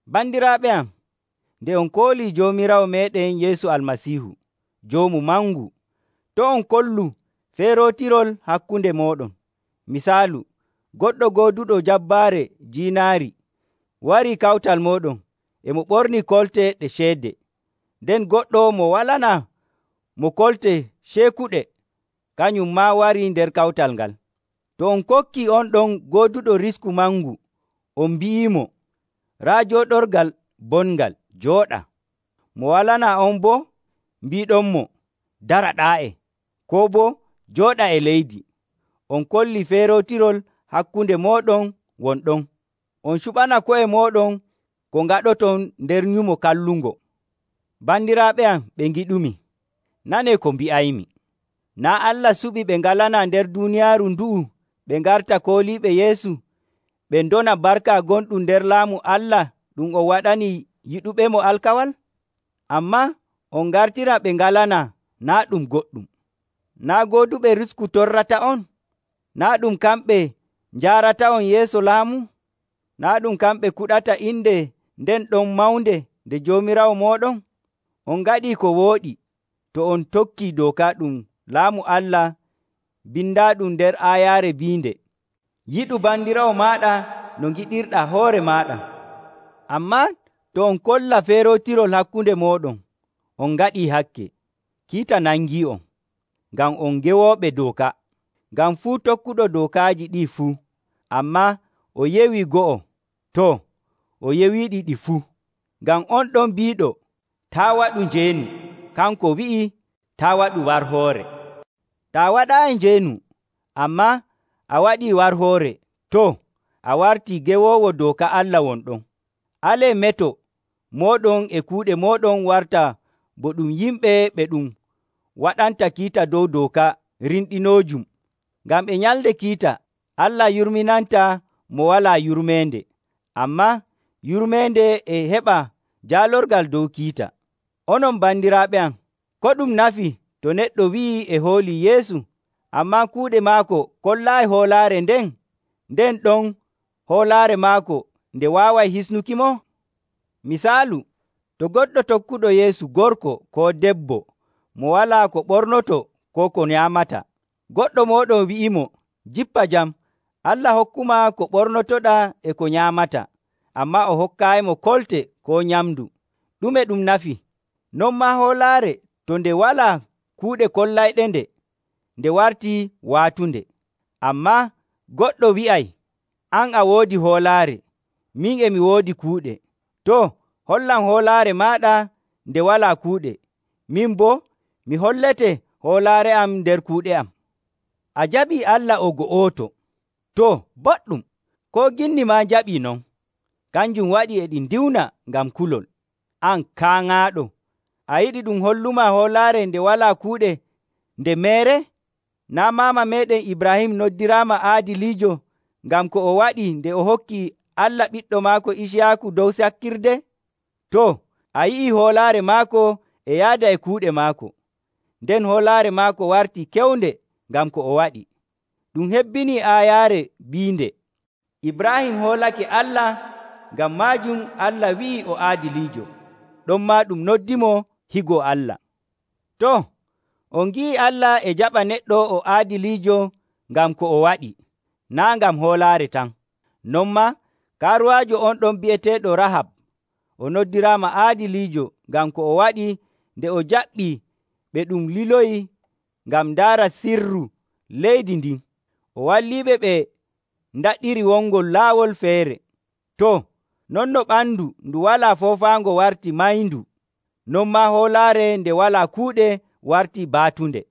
Bandiraaɓe am, nde on koolii Joomiraawo meeɗen Yeesu Almasiihu, Joomu Mangu, to' on kollu feerootirol hakkunde mooɗon. Misaalu, goɗɗo gooduɗo jabbaare jiinaari warii kawtal mooɗon e mo ɓornii kolte ɗe ceede, nden goɗɗo mo walanaa mo kolte ceekuɗe kanum maa warii nder kawtal ngal. To on kokkii on ɗon gooduɗo risku mangu on mbi'iimo, “Raa jooɗorgal bongal, jooɗa,” mo walanaa on boo mbiiɗonmo, “Dara ɗaa'e,” koo boo, “Jooɗa e leydi,” on kollii feerootirol hakkunde mooɗon won ɗon, on cuɓana ko'e mooɗon ko ngaɗoton nder nyumo kallungo. Bandiraaɓe am ɓe ngiɗumi, nanee ko mbi'aymi. Naa' Allah suɓii ɓe ngalanaa nder duuniyaaru ndu'u ɓe ngarta kooliiɓe Yeesu ɓe ndona barka gonɗum nder laamu Allah ɗum o waɗani yiɗuɓemo alkawal? Ammaa on ngartira ɓe ngalanaa naa' ɗum goɗɗum. Naa' gooduɓe risku torrata'on? Naa' ɗum kamɓe njaarata'on yeeso laamu? Naa' ɗum kamɓe kuɗata inde nden ɗon mawnde nde Joomiraawo mooɗon? On ngaɗii ko wooɗi to on tokkii dooka ɗum Laamu Allah bindaaɗum nder aayaare biinde, “Yiɗu bandiraawo maaɗa no ngiɗirɗaa hoore maaɗa.” Ammaa to on kolla feerootirol hakkunde mooɗon, on ngaɗii hakke. Kiita nangii'on, ngam on gewooɓe dooka. Ngam fuu tokkuɗo dookaaji ɗi fuu, ammaa o yewi go'o, too, o yewiiɗi ɗi fuu. Ngam on ɗon biiɗo, “Taa' waɗu njeenu,” kanko wi'i, “Taa' waɗu warhoore.” Taa waɗaayi njeenu, ammaa a waɗii warhoore, too, a wartii gewoowo dooka Allah won ɗon. Alee meto mooɗon e kuuɗe mooɗon warta bo ɗum yimɓe ɓe ɗum waɗanta kiita dow dooka rimɗinoojum. Ngam e nyalnde kiita, Allah yurminantaa mo walaa yurmeende. Ammaa yurmeende e heɓa jaalorgal dow kiita. Onon bandiraaɓe am, ko ɗum nafi to neɗɗo wi'ii e hoolii Yeesu, ammaa kuuɗe maako kollaayi hoolaare nden? Nden ɗon hoolaare maako nde waaway hisnukimo? Misaalu, to goɗɗo tokkuɗo Yeesu gorko koo debbo mo walaa ko ɓornotoo koo ko nyaamata, goɗɗo mooɗon wi'iimo, “Jippa jam! Allah hokkumaa ko ɓornotoɗaa e ko nyaamataa,” ammaa o hokkaayimo kolte koo nyamndu, ɗume ɗum nafi? Non maa hoolaare, to nde walaa kuuɗe kollayɗende, nde wartii waatunde. Ammaa goɗɗo wi'ay, “An a woodi hoolaare, min e mi woodi kuuɗe.” Too, hollam hoolaare maaɗa nde walaa kuuɗe. Min boo, mi hollete hoolaare am nder kuuɗe am. A jaɓii Allah o go'oto. Too, boɗɗum! Koo ginni maa njaɓii non. Kanjum waɗi e ɗi ndiwna ngam kulol. An kaaŋaaɗo! A yiɗi ɗum hollumaa hoolaare nde walaa kuuɗe nde meere? Naa' maama meeɗen Ibraahim noddiraama aadiliijo ngam ko o waɗi nde o hokki Allah ɓiɗɗo maako Iciyaaku dow sakkirde? Too, a yi'ii hoolaare maako e yaada e kuuɗe maako. Nden hoolaare maako wartii kewnde ngam ko o waɗi. Ɗum hebbinii aayaare biinde, “Ibraahim hoolake Allah, ngam maajum Allah wi'i o aadiliijo.” Ɗonmaa ɗum noddimo higo Allah. Too, on ngi'ii Allah e jaɓa neɗɗo o aadiliijo ngam ko o waɗi, naa' ngam hoolaare tan. Non maa, kaaruwaajo on ɗon bi'eteeɗo Rahab, o noddiraama aadiliijo ngam ko o waɗi nde o jaɓɓii ɓe ɗum liloyi ngam ndaara sirru leydi ndin. O walliɓe ɓe ndaɗiri wongol laawol feere. Too, non no ɓandu ndu walaa foofaango wartii mayndu, non maa hoolaare nde walaa kuuɗe wartii baatunde.